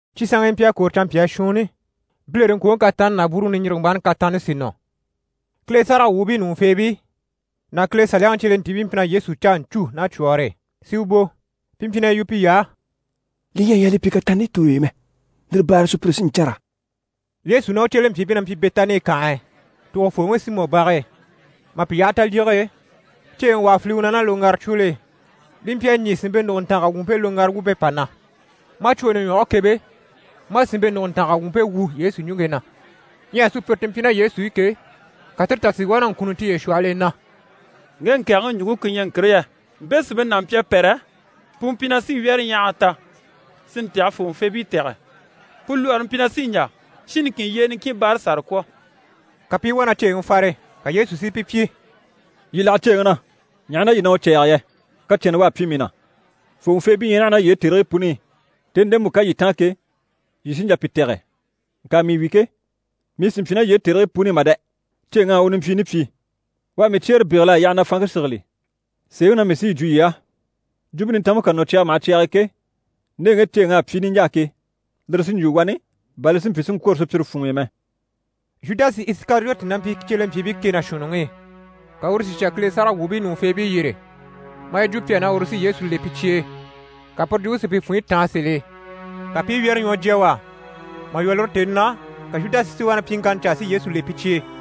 Cyi sanŋkii mpyi a kwôro canmpyaa shuunni, bilereŋkwoŋi kataanni ná bwúuruŋi niɲjirigembaaŋi kataanni sí nɔ. Kile sáragawwuubii ɲùŋufeebii ná Kile Saliyaŋi cyelentiibii mpyi na Yesu caa ɲcû ná cwɔ̀ɔre e, si u bò. Pi mpyi na yi yu piy'á: «Li ɲyɛ a yaa li pyi kataanni tooy'e mɛ, lire baare e sùpyire sí n‑cânra.» Yesu ná u cyelempyiibii na mpyi Bɛtani kànhe e, tògofooŋi Simɔ bage e. Mà pi yaha talyige e, ceeŋi wà à file u na ná loŋgaracwol'e, li mpyi a ɲî sìnmpe nùguntanga wumpe loŋgara wumpe pà na. Maa cwooni ɲwɔge kebe, maa sìnmpe nùguntanga wumpe wu Yesu ɲùŋke na. Ɲyɛ sùpyire ti mpyi ná Yesu i ke, ka tire tà si wá na ŋkunni tiye shwɔhɔl'e na: «Ŋge ŋkɛ̀ɛgɛŋi ɲùŋke ku ɲyɛ ŋkire yɛ? Mpe sìnmpe n'a mpyi a pɛ́rɛ, pu mpyi na sí wyɛ́rɛɲyahaga ta, si ntaha fòŋɔfeebii tɛ̀gɛ. Pu lwɔɔre mpyi na sí n‑jà shin niŋkin yyee niŋkin báara sàra kwɔ̀.» Ka pi i wá na ceeŋi fare. Ka Yesu si pi pyi: «Yii láha ceeŋi na! Ɲaha na yii ɲyɛ na u cɛ̂ɛge yɛ? Kacɛnnɛ u à pyi mii na. Fòŋɔfeebii ɲyɛ naha ná yii e tèrigii puni i, tèni ndemu ká yii táan ke, yii sí n‑jà pi tɛ̀gɛ, ŋka mii wi ke, mii sì n‑pyi ná yii e tèrigii puni i mà dɛ! Ceeŋ'à u nimpyiini pyi. U à mii cyeere bégel'a yaha na fanŋke sigili. Sèeŋi na mii sí yi jwo yii á, Jwumpe Nintanmpe ká nɔ cyaga maha cyag'e ke, nde ŋge ceeŋ'à pyi niɲjaa ke, lire sí n‑jwo wani bà li si mpyi si ŋkwôro sùpyire funŋ'i mɛ.» Zhudasi Isikariyoti na mpyi cyelempyiibii kɛ ná shuunniŋi i, ka uru si shà Kile sáragawwuubii ɲùŋufeebii yyére, maa yi jwo pi á na uru sí Yesu le pi cye e. Ka puru jwumpe si pi funɲyi táan sèl'e, ka pi i wyɛ́rɛ ɲwɔ jya u á. Mà lwɔ́ lire tèni na, ka Zhudasi si wá na pyiŋkanna caa si Yesu le pi cye e.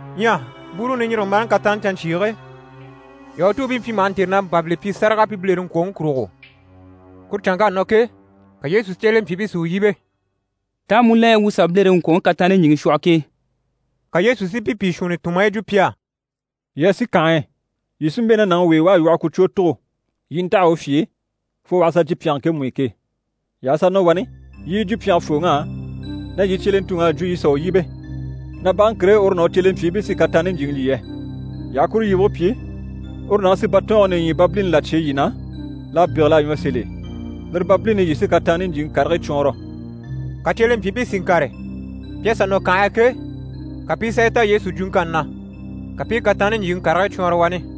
Ɲyɛ bwúuruŋi niɲjirigembaaŋi kataanni canɲcyiige, Yahutuubii mpyi maha ntêre na mpàbili pyi sáraga pi bilereŋkwoŋi kurugo. Kuru canŋk'à nɔ ke, ka Yesu cyelempyiibii si u yíbe: «Taa mu la ɲyɛ wuu u sà bilereŋkwoŋi kataanni ɲjyìŋi shwɔhɔ ke?» Ka Yesu si pi pìi shuunni tun, maa yi jwo pi á: «Yii a sì kànhe e, yii sí n‑bɛ̂ ná nàŋi w'e, u à lwɔhɔ kucwoo tugo. Yii i ntaha u fye e fo u aha sà jyè pyɛnge ŋkemu i ke. Yii aha sà nɔ wani, yii i yi jwo pyɛngefooŋ'á, na yii cyelentuŋ'à jwo yii sà u yíbe, na bage ŋkire e uru ná u cyelempyiibii sí kataanni ɲjyìŋi lyî yɛ. Yii aha kuru yibige pyi, uru nàŋi sí batɔɔnge nìɲyibabilini là cyêe yii na, l'à bégel'a ɲwɔ sèl'e. Lire babilini i, yii sí kataanni ɲjyìŋi karigii cwɔɔnrɔ.» Ka cyelempyiibii si ŋkàre, pi à sà nɔ kànhe e ke, ka pi i sà yi ta Yesu jwuŋkanni na. Ka pi i kataanni ɲjyìŋi karigii cwɔɔnrɔ wani.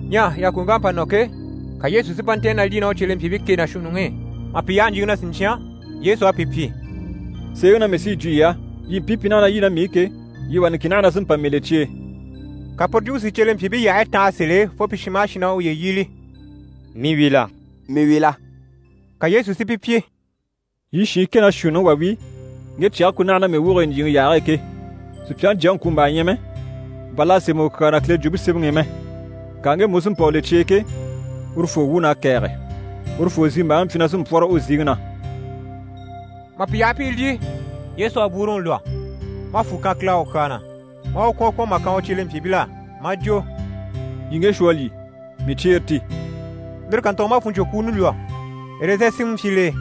Ɲyɛ yàkoŋk'à pa nɔ ke, ka Yesu si mpa ntɛ̀ɛn na lyî ná u cyelempyiibii kɛ ná shuunniŋi i. Mà pi yaha ɲjyìŋi na siɲcyan, Yesu à pi pyi: «Sèeŋi na mii sí yi jwo yii á, yii mpii pi naha na lyî ná mii i ke, yii wà niŋkin naha na sí n‑pa mii le cye e.» Ka puru jwumpe si cyelempyiibii yyahayi tanha sèl'e fo pi shin maha shin na u yíbili: «Mii wi la? Mii wi la?» Ka Yesu si pi pyi: «Yii shiin kɛ ná shuunniŋi wà wi, ŋge cyɛge ku naha na mii woge e ɲjyìŋi yaage e ke. Supyaŋi Jyaŋi ŋkwùmbaa ɲyɛ mɛ, bà l'à sémɛ u kyaa na Kile Jwumpe Semɛŋi i mɛ. Ŋka ŋgemu u sí n‑pa u le cye e ke, urufoo wuun'à kɛ̀ɛge! Urufoo zimbaaŋi mpyi na sí n‑pwɔ́rɔ u ziŋi na.» Mà pi yaha pi i lyî, Yesu à bwúuruŋi lwɔ́, maa fwù kan Kile á u kyaa na, maa u kwɔ̀n kwɔ̀n mà kan u cyelempyiibil'á, maa jwo: «Yii ŋge shwɔ a lyî, mii cyeere ti.» Lire kàntugo maa fùnɲcwokwuuni lwɔ́, ɛrɛzɛn sinmɛ mpyi l'e,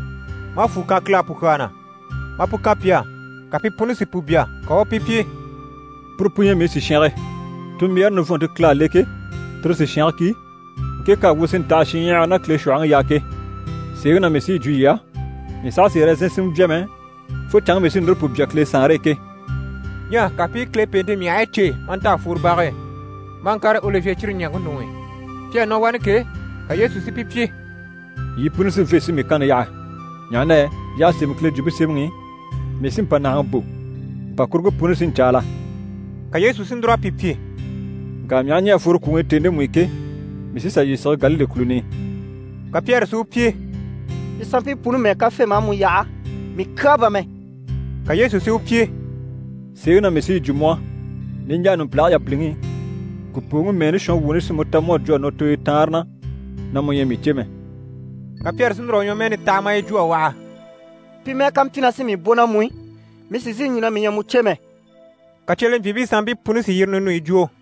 maa fwù kan Kile á pu kyaa na, maa pu kan pi á, ka pi puni si pu bya. Ka u u pi pyi: «Puru pu ɲyɛ mii sìshange, tunmbyaare nivɔnnte Kile à le ke, tire sìshange ki, ŋke k'à wu si ntaha shinɲyahara ná Kile shwɔ̀hɔŋi yaa ke. Sèeŋi na mii sí yi jwo yii á, mii saha sì ɛrɛzɛn sinmɛ bya mɛ, fo canŋke mii sí núru pu bya Kile Saanre e ke.» Ɲyɛ ka pi i Kile pèente myahigii cêe maa nta a fworo bage e, maa ŋkàre Olivye cire ɲaŋke ɲuŋ'i. Pi à nɔ wani ke, ka Yesu si pi pyi: «Yii puni sí n‑fê si mii kanni yaha, ɲaha na yɛ y'à sémɛ Kile Jwumpe Semɛŋi i “Mii sí mpànahaŋi bò, mpàkuruŋke puni sí n‑caala.”» Ka Yesu si núr'a pi pyi: «Ŋka mii aha ɲɛ̀ a fworo kwùŋi i tèni ndemu i ke, mii sí n‑sà yii sige Galile kùluni i.» Ka Pyɛri si u pyi: «Pi sanmpii puni mɛ́ɛ ká fê, maa mu yaha, mii kyaa bà mɛ.» Ka Yesu si u pyi: «Sèeŋi na mii sí yi jwo mu á, niɲjaa numpilage yabiliŋi i, ŋkùpooŋi mɛɛni shɔnwuuni sí mu ta mu à jwo a nɔ tooyo taanre na na mu ɲyɛ a mii cè mɛ.» Ka Pyɛri si núr'a u ɲwɔmɛɛni taha maa yi jwo a waha: «Pi mɛ́ɛ ká mpyi na sí mii bò ná mu i, mii sì n‑sìi n‑jwo na mii ɲyɛ a mu cè mɛ.» Ka cyelempyiibii sanmpii puni si yire ninuyi jwo.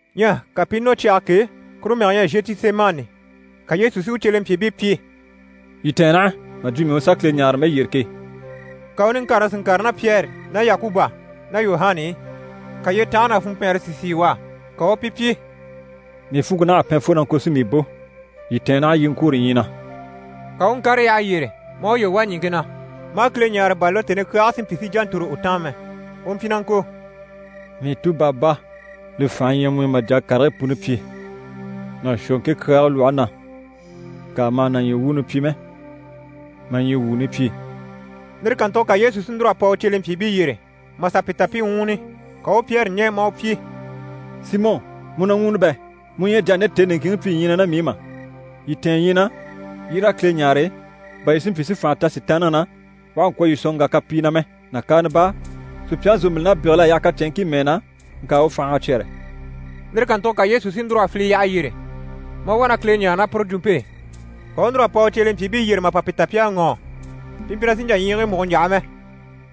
Ɲyɛ ka pi i nɔ cyage k'e, kuru mɛge ɲyɛ Zhetisemani. Ka Yesu si u cyelempyiibii pyi: «Yii tɛ̀ɛn naha mà jwo mii u sà Kile ɲáare mɛyyere ke.» Ka u niŋkareŋi si ŋkàre ná Pyɛri ná Yakuba ná Yuhana i. Ka yyetanhare ná funmpɛɛnre si sìi u á. Ka u u pi pyi: «Mii funŋke naha a pɛn fo na ŋko si mii bò. Yii tɛ̀ɛn naha yii i ŋkwôro ɲyii na.» Ka u u ŋkàre yyaha yyére, maa uye wà ɲìŋke na, maa Kile ɲáare, bà lire tèni kyaage si mpyi si ɲjà ntòro u taan mɛ. U mpyi na ŋko: «Mii Tu Baba, li fànhe ɲyɛ mu i mà jà a karigii puni pyi. Na shwɔ ŋke kyaage lwɔhe na. Ŋka ma hà na ɲyii wuuni pyi mɛ, ma ɲyii wuuni pyi.» Lire kàntugo ka Yesu si núr'a pa u cyelempyiibii yyére, mà sà pi ta pi i ŋwúuni. Ka u u Pyɛri ɲɛ̀, maa u pyi: «Simɔ, mu na ŋwúuni bɛ? Mu ɲyɛ a jà a nde tèni niŋkinŋi pyi ɲyii na ná mii i mà? Yii tɛ̀ɛn ɲyii na, yii raa Kile ɲáare, bà yii si mpyi si fànha ta Sitaanniŋi na, u àha ŋkwɔ̀ yii sɔ̀n ŋgà kapii na mɛ. Nàkaana baa, sùpyaŋi zòmbilin'à bégel'a yaha kacɛnŋkii mɛɛ na, ŋka u fành'à cyɛ́rɛ.» Lire kàntugo ka Yesu si núr'a file yyaha yyére, maa wá na Kile ɲáare ná puru jwunumpe e. Ka u u núr'a pa u cyelempyiibii yyére mà pa pi ta pi à ŋɔ́ɔ, pi mpyi na sì n‑jà ɲyiigii múgo n‑yaha mɛ.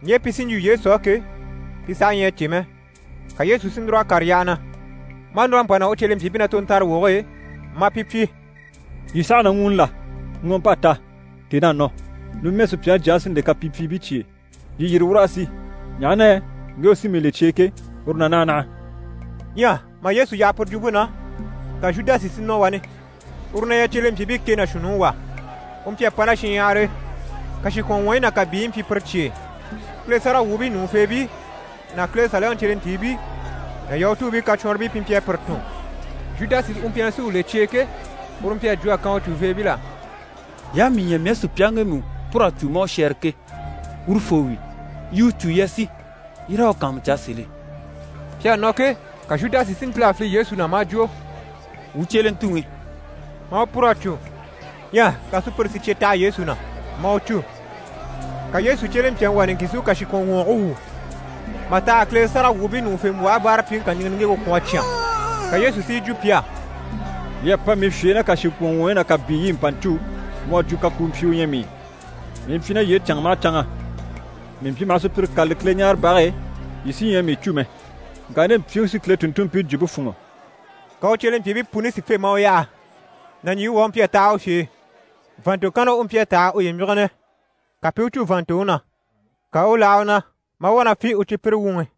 Ɲje pi sí n‑jwo Yesu á ke, pi saha ɲyɛ a cè mɛ. Ka Yesu si núr'a kàre yyaha na, maa núr'a pa nɔ u cyelempyiibii na tontanrawoge e, maa pi pyi: «Yii saha na ŋwúuni la? Ŋɔɔmp'à ta, tèn'à nɔ. Numɛ, Supyaŋi Jyaŋi sí n‑le kapimpyiibii cye e. Yii yîri, wuu raa sì, ɲaha na yɛ ŋge u sí mii le cye e ke, uru na naha naha.» Ɲyɛ mà Yesu yaha puru jwumpe na, ka Zhudasi si nɔ wani, uru na ɲyɛ cyelempyiibii kɛ ná shuunniŋi wà. U mpyi a pa ná shinɲyahar'e, kàshikwɔnŋwɔɔyi ná kàbiiyi mpyi pire cye e. Kile sáragawwuubii ɲùŋufeebii ná Kile Saliyaŋi cyelentiibii ná Yahutuubii kacwɔnribii pi mpyi a pire tun. Zhudasi u mpyi na sí u le pi cye e ke, uru mpyi a jwo a kan u cùveebil'á: «Yii aha mii ɲya mii à sùpyaŋi ŋgemu pûr'a cû maa u shɛ́ɛre ke, urufoo wi. Yii i u cû, yii a sì, yii raa u kàanmucaa sèl'e.» Pi à nɔ ke, ka Zhudasi si ntíl'a file Yesu na, maa jwo: «Wuu cyelentuŋi» maa u pûr'a cû. Ɲyɛ ka sùpyire si cye taha Yesu na, maa u cû. Ka Yesu cyelempyaŋi wà niŋkin si u kàshikwɔnŋwɔɔge wwû mà taha a Kile sáragawwuubii ɲùŋufembwɔhe báarapyiŋi niŋgeŋke kà kwɔ̀n a cyán. Ka Yesu si yi jwo pi á: «Yii à pa mii fye e ná kàshikwɔnŋwɔɔyi ná kàbiiyi i mpa ɲcû, mu à jwo kakuumpyi u ɲyɛ mii. Mii mpyi ná yii e canŋa maha canŋa. Mii mpyi maha sùpyire kâlali Kileɲaarebage e, yii sí ɲyɛ a mii cû mɛ. Ŋka nde mpyiŋi sí Kile tùnntunmpii jwumpe fûnŋɔ.» Ka u cyelempyiibii puni si fê, maa u yaha. Nàɲjiiŋi wà u mpyi a taha u fye e, vàannto kanna u mpyi a taha a uye míginɛ. Ka pi i u cû vàanntoŋi na. Ka u u láha u na, maa wá na fî u cípyire wuŋi.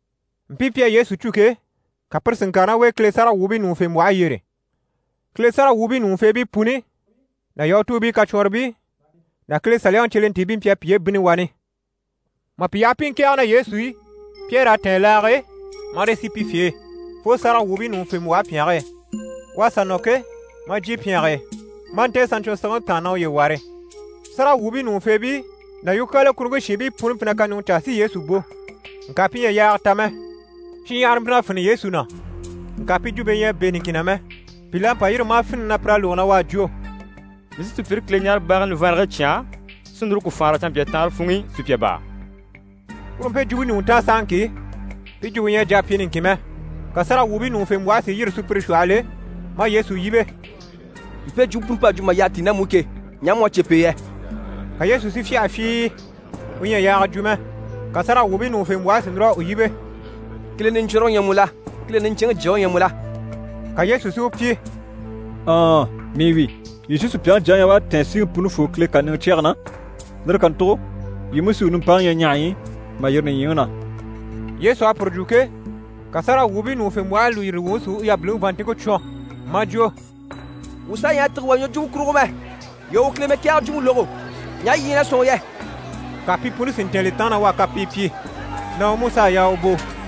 Mpii pi à Yesu cû ke, ka pire si ŋkàre ná u e Kile sáragawwuubii ɲùŋufembwɔhe yyére. Kile sáragawwuubii ɲùŋufeebii puni ná Yahutuubii kacwɔnribii ná Kile Saliyaŋi cyelentiibii mpyi a piye bínni wani. Mà pi yaha pi i ŋkɛ̀ɛge ná Yesu i, Pyɛri à tɛ̀ɛn laage e, marii sì pi fye e fo sáragawwuubii ɲùŋufembwɔhe pyɛnge e. U à sà nɔ ke, maa jyè pyɛnge e, maa ntɛ̀ɛn saɲcwɔnsigibii taan na uye ware. Sáragawwuubii ɲùŋufeebii ná yukyaala kuruŋke shiinbii puni mpyi na kaɲuŋɔ caa si Yesu bò. Ŋka pi ɲyɛ a yaaga ta mɛ. Shinɲyahara mpyi na fini Yesu na, ŋka pi jwumpe ɲyɛ a bɛ̂ niŋkin na mɛ. Pìl'à pa yîri, maa fini na pir'à lógo na u à jwo: «Mii sí sùpyire Kileɲaarebage nivanrage cyán, sí núru ku faanra canmpyaa taanre funŋ'i sùpya baa.» Puru mpe ɲùŋɔ taan sahaŋki, pi jwumpe ɲyɛ a jà a pyi niŋkin mɛ. Ka sáragawwuubii ɲùŋufembwɔhe si yîri sùpyire shwɔhɔl'e, maa Yesu yíbe: «Mpe jwumpe puni p'à jwo mà yyaha tíi ná mu i ke, ɲaha mu à cè p'e yɛ?» Ka Yesu si fyâha fyii, u ɲyɛ a yaaga jwo mɛ. Ka sáragawwuubii ɲùŋufembwɔhe si núr'a u yíbe: «Kile Niɲcwɔnrɔŋi u ɲyɛ mu la? Kileŋi Niɲcɛnŋi Jyaŋi u ɲyɛ mu la?» Ka Yesu si u pyi: «Ɔɔn, mii wi! Yii sí Supyaŋi Jyaŋi ɲya u à tɛ̀ɛn Siŋi Punifoo Kile kàniŋɛ cyɛge na, lire kàntugo yii mú sí u nimpaŋi ɲya ɲahaɲyi i, mà yîri nìɲyiŋi na.» Yesu à puru jwo ke, ka sáragawwuubii ɲùŋufembwɔhe lùyiri wuŋi si u yabiliŋi vàanntinŋke cwɔn, maa jwo: «Wuu saha ɲyɛ a tîge wà ɲwɔjwumɔ kurugo mɛ. Yii à u Kile mɛkɛɛgɛ jwumpe lógo. Ɲaha yii ɲyɛ na sɔ̂nŋi yɛ?» Ka pi puni si ntɛ̀ɛn li taan na u à kapii pyi, na u mú s'à yaa u bò.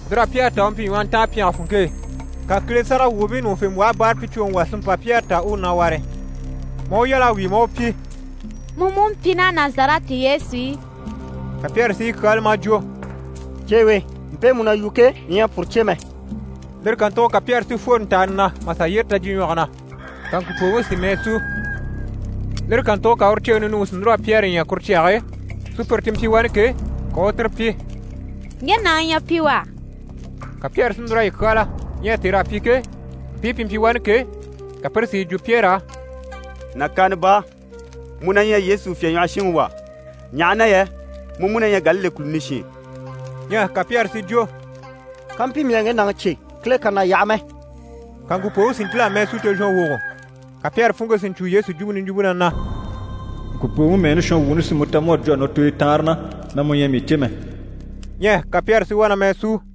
Lir'à Pyɛri ta u mpyi ɲwɔhɔntaan pyɛnge funŋke e. Ka Kile sáragawwuubii ɲùŋufembwɔhe báarapyicwoŋi wà si mpa Pyɛri ta u u na ware, maa u yal'a wíi maa u pyi: «Mu mú mpyi ná Nazarɛti Yesu e!» Ka Pyɛri si yi kyáala maa jwo: «Ceewe, mpe mu na yu ke, mii ɲyɛ a puru cè mɛ.» Lire kàntugo ka Pyɛri si fworo ntàani na mà sà yyére tajyiɲwɔge na, [ka ŋkùpooŋi si mɛɛ sú.] Lire kàntugo ka uru ceeŋi ninuŋi si núr'a Pyɛri ɲya kuru cyage e. Sùpyire ti mpyi wani ke, ka u u tire pyi: «Ŋge nàŋi ɲyɛ pi wà.» Ka Pyɛri si núr'a yi kyáala. Ɲyɛ tèr'à pyi ke, mpii pi mpyi wani ke, ka pire si yi jwo Pyɛri á: «Nàkaana baa, mu na ɲyɛ Yesu fyèɲwɔhɔshinŋi wà, ɲaha na yɛ mu mú na ɲyɛ Galile kùluni shin.» Ɲyɛ ka Pyɛri si jwo: «Kampyi mii à ŋge nàŋi cè, Kile kà na yaha mɛ!» Ka ŋkùpooŋi si ntíl'a mɛɛ sú tozhɔnwogo. Ka Pyɛri funŋke si ɲcwo Yesu jwumpe niɲjwumpe na na: «Ŋkùpooŋi mɛɛni shɔnwuuni sí mu ta mu à jwo a nɔ tooyo taanre na na mu ɲyɛ a mii cè mɛ.» Ɲyɛ ka Pyɛri si wá na mɛɛ súu.